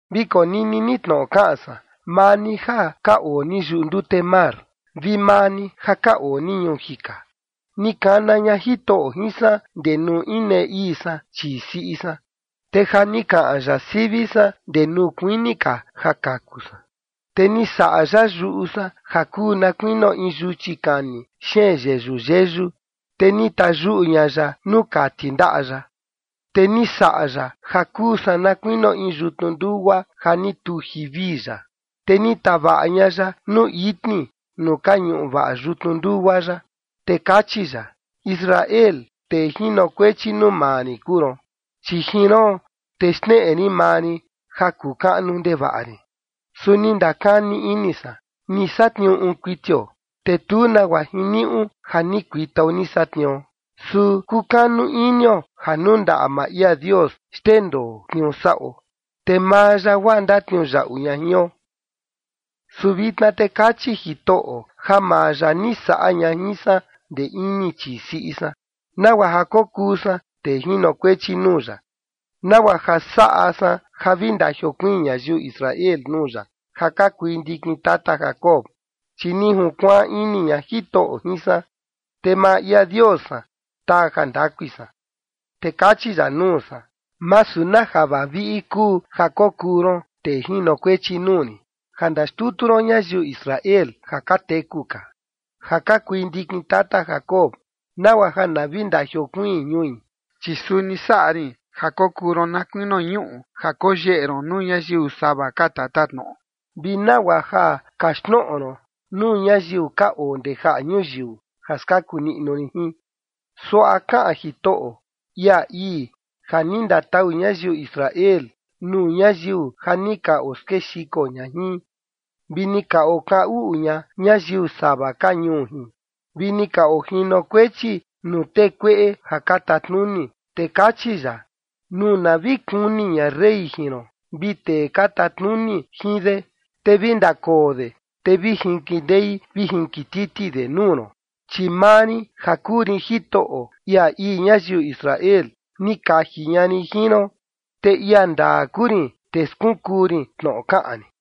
Vi konini ni tnoꞌo kaꞌan san, maa ni ja ka oo ni yuꞌu ndute mar, vi maa ni ja ka oo ni ñuu jika. Ni kana ña Jitoꞌo jin san ndee nuu inee ii san chii siꞌi san, te ja ni kaꞌan ya sivi san ndee nuu kuini ka ja kaku san. Te ni saꞌa ya yuꞌu san ja kuu na kuinio in yuchi kani xeen yeyu yeyu, te ni tayuꞌu ña ya nuu kati ndaꞌa ya. Te ni saꞌa ya ja kuu san na kuinio in yutnu ndugua ja ni tuji vii ya, te ni tavaꞌa ña ya nuu itni nuu ka ñuꞌu vaꞌa yutnu ndugua ya. Te kachi ya: “Israel, tee jinokuechi nuu maa rin kuu ron, chi jin roon, te xneꞌe rin maa rin ja kuu kaꞌnu ndevaꞌa rin”. Su ni ndakani ini san: “Ni satniuu uun kuitio, te tu nagua jiniuꞌu ja ni kuitao ni satniuo. Su kukanu inio ja nuu ndaꞌa maa ia Dios xndendoo tniuu saꞌo, te maa ya guaa ndatniuyaꞌu ña jion.” Su vitna te kachi Jitoꞌo ja maa ya ni saꞌa ña jin san ndee ini chii siꞌi san, nagua ja kokuu san tee jinokuechi nuu ya, nagua ja saꞌa san ja vi ndajiokuiin ñayiu Israel nuu ya ja ka kui ndikin tata Jacob, chi ni junkuaan ini ña Jitoꞌo jin san, te maa ia Dios san taa jandakui san. Te kachi ya nuu san: “Masu na ja vaviꞌi kuu ja kokuu ron tee jinokuechi nuu rin, ja ndaxtutu ron ñayiu Israel ja ka teku ka, ja ka kui ndikin tata Jacob, nagua ja na vi ndajiokuiin ñui. Chi suni saꞌa rin ja kokuu ron na kuinio ñuꞌu ja koyeꞌe ron nuu ñayiu sava ka tatatnoꞌo, vi nagua ja kaxtnoꞌo ron nuu ñayiu ka oo ndee jaꞌa ñuyiu ja skaku niꞌnu rin jin.” Suaꞌa kaꞌan Jitoꞌo, ia ii ja ni ndatau ñayiu Israel nuu ñayiu ja ni ka oskexiko ña jin, vi ni ka okaꞌan uꞌun ña ñayiu sava ka ñuu jin, vi ni ka ojinokuechi nuu tee kueꞌe ja ka tatnuni, te kachi ya: “Nuu na vi kuni ña rey jin ron vi tee ka tatnuni jin de, te vi ndakoo de, te vi jinkindei vi jinkititi de nuu ron, chi maa rin ja kuu rin Jitoꞌo, ia ii ñayiu Israel, ni kaji ña rin jin ron, te ia ndaa kuu rin, te skunkuu rin tnoꞌo kaꞌan rin”.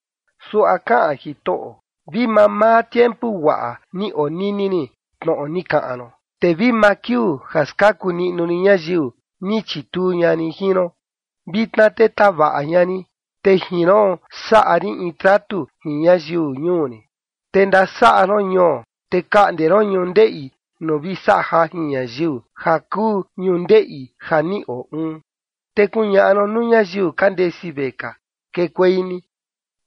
Suaꞌa kaꞌan Jitoꞌo: “Vi mamaa tiempu guaꞌa ni onini rin tnoꞌo ni kaꞌan ron, te vi maa kiuu ja skaku niꞌnu rin ñayiu, ni chituu ña rin jin ron. Vitna te tavaꞌa ña rin, te jin roon saꞌa rin in tratu jin ñayiu ñuu rin, te ndasaꞌa ron ñuo, te kaꞌnde ron ñundeꞌi nuu vi saꞌa jajin ñayiu, ja kuu ñundeꞌi ja ni oo uun. Te kuñaꞌa ron nuu ñayiu ka ndesi vekaa: Kekuei ni.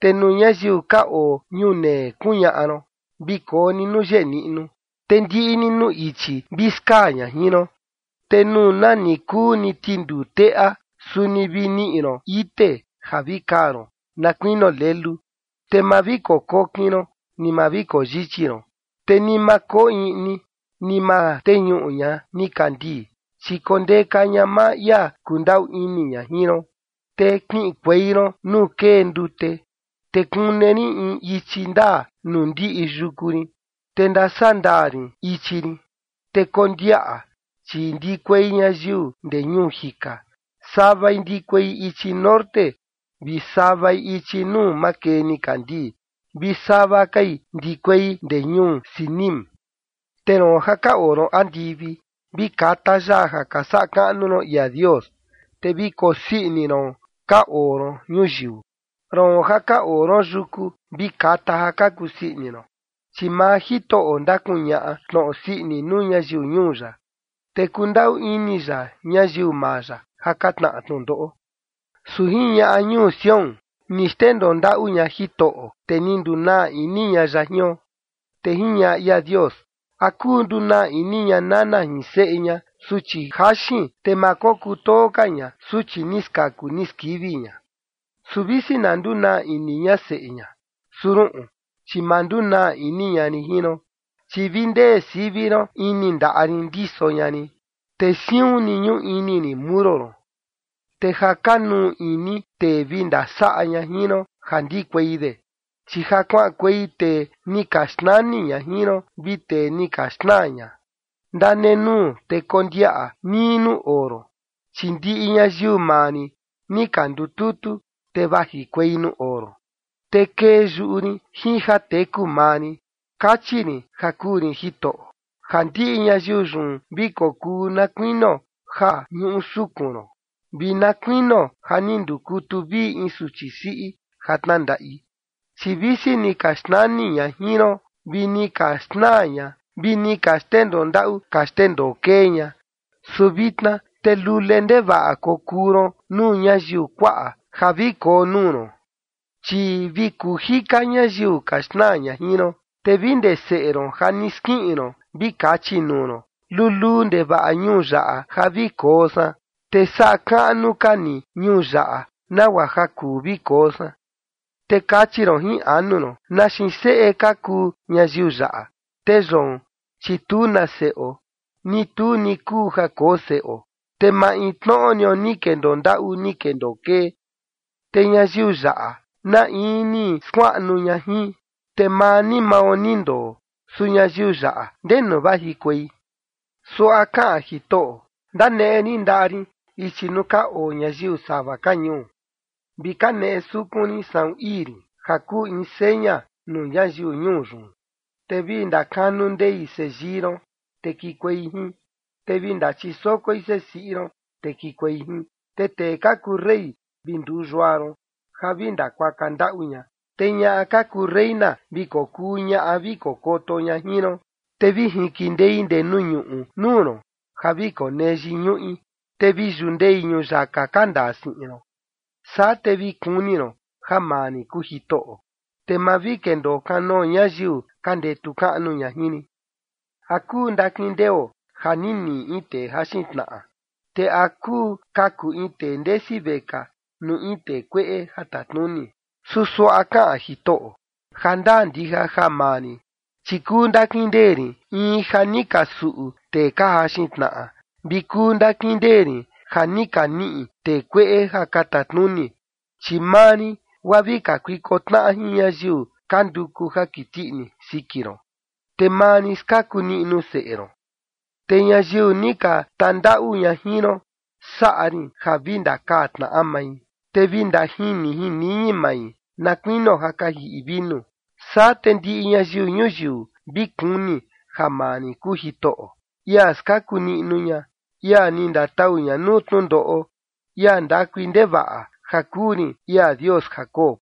Te nuu ñayiu ka oo ñunee kuñaꞌa ron: Vi koo ni nuu yeꞌe niꞌnu. Te ndiꞌi ni nuu ichi vi skaa ña jin ron, te nuu nani kuu ni tinduu teꞌa, suni vi niꞌi ron ite ja vi kaa ron, na kuinio lelu. Te ma vi kokokin ron, ni ma vi koyichi ron, te ni ma koo iꞌni, ni ma teñuꞌu ña nikandii, chi kondeka ña maa ia kundaꞌu ini ña jin ron, te kiꞌinkuei ron nuu kee ndute. Te kune rin in ichi ndaa nuu ndiꞌi yuku rin, te ndasandaa rin ichi rin. Te kondiaꞌa, chi ndikuei ñayiu ndee ñuu jika, savai ndikuei ichi norte vi savai ichi nuu makee nikandii, vi sava kai ndikuei ndee ñuu Sinim.” Te roon ja ka oo ron andivi, vi kata yaa ja ka saꞌa kaꞌnu ron ia Dios, te vi kokusii ini ron ka oo ron ñuyiu. Roon ja ka oo ron yuku, vi kata ja ka kusii ini ron, chi maa Jitoꞌo ndakuñaꞌa tnoꞌo sii ini nuu ñayiu ñuu ya, te kundaꞌu ini ya ñayiu maa ya ja ka tnaꞌa tnundoꞌo. Su jiñaꞌa ñuu Sión: “Ni xndendoo ndaꞌu ña Jitoꞌo, te ni ndunaa ini ña ya jion”. Te jiñaꞌa ia Dios: “¿A kuu ndunaa ini ña nana jin seꞌe ña, suchi jaxin, te ma kokutoo ka ña suchi ni skaku ni skivi ña? Su visi na ndunaa ini ña seꞌe ña, su ruꞌun, chi ma ndunaa ini ña rin jin ron. Chi vi ndee sivi ron ini ndaꞌa rin ndiso ña rin, te siun ni ñuꞌu ini rin muro ron. Te ja kanuu ini tee vi ndasaꞌa ña jin ron ja ndikuei de, chi ja kuaꞌankuei tee ni ka xnani ña jin ron vi tee ni ka xnaa ña. Ndanenuu te kondiaꞌa nii nuu oo ron, chi ndiꞌi ñayiu maa rin ni ka ndututu, te vajikuei nuu oo ron. Te kee yuꞌu rin jin ja teku maa rin, kachi rin ja kuu rin Jitoꞌo, ja ndiꞌi ñayiu yun vi kokuu na kuinio ja ñuꞌu sukun ron vi na kuinio ja ni ndukutu vii in suchi siꞌi ja tnandaꞌi. Chi visi ni ka xnani ña jin ron vi ni ka xnaa ña vi ni ka xndendoo ndaꞌu ka xndendoo kee ña, su vitna te lule ndevaꞌa kokuu ron nuu ñayiu kuaꞌa ja vi koo nuu ron, chi vi kuu jika ñayiu ka xnaa ña jin ron. Te vi ndee seꞌe ron ja ni skiꞌin ron vi kachi nuu ron: Luluu ndevaꞌa ñuu yaꞌa ja vi koo san, te saꞌa kaꞌnu ka ni ñuu yaꞌa nagua ja kuu vi koo san. Te kachi ron jin anu ron: ¿Na xiin seꞌe ka kuu ñayiu yaꞌa? te yoon, chi tu na seꞌo, ni tu ni kuu ja koo seꞌo, te maintnoꞌo nio ni kendoo ndaꞌu ni kendoo kee, te ñayiu yaꞌa, ¿na in ni skuaꞌnu ña jin? Te maa ni mao ni ndoo, su ñayiu yaꞌa, ¿ndenu vajikuei?” Suaꞌa kaꞌan Jitoꞌo: “Ndaneꞌe rin ndaꞌa rin ichi nuu ka oo ñayiu sava ka ñuu, vi kaneꞌe sukun rin saꞌun ii rin ja kuu in seña nuu ñayiu ñuu yun, te vi ndakanu ndei seyii ron, te kikuei jin, te vi ndachisokoi sesiꞌi ron, te kikuei jin. Te tee ka kuu rey vi nduu yua ron ja vi ndakuaka ndaꞌu ña, te ñaꞌa ka kuu reina vi kokuu ñaꞌa vi kokoto ña jin ron, te vi jinkindei ndee nuu ñuꞌu nuu ron, ja vi konee yiñuꞌi, te vi yundei ñuyaka ka ndaa siꞌin ron. Saa te vi kuni ron ja maa rin kuu Jitoꞌo, te ma vi kendoo kanoo ñayiu ka ndetu kaꞌnu ña jin rin.” ¿A kuu ndakindeo ja ni niꞌi in tee jaxin tnaꞌa? ¿Te a kuu kaku in tee ndesi vekaa nuu in tee kueꞌe ja tatnuni? Su suaꞌa kaꞌan Jitoꞌo: “Jandaa ndija ja maa rin, chi kuu ndakindee rin in ja ni ka suꞌu tee ka jaxin tnaꞌa, vi kuu ndakindee rin ja ni ka niꞌi tee kueꞌe ja ka tatnuni. Chi maa rin, guaa vi kakuiko tnaꞌa jin ñayiu ka nduku ja kiti ini siki ron, te maa rin skaku niꞌnu seꞌe ron. Te ñayiu ni ka tandaꞌu ña jin ron, saꞌa rin ja vi ndakaa tnaꞌa mai, te vi ndajini jin niñi mai na kuinio ja ka jiꞌi vinu. Saa te ndiꞌi ñayiu ñuyiu vi kuni ja maa rin kuu Jitoꞌo, ia skaku niꞌnu ña, ia ni ndatau ña nuu tnundoꞌo, ia ndakui ndevaꞌa ja kuu rin ia Dios Jacob.”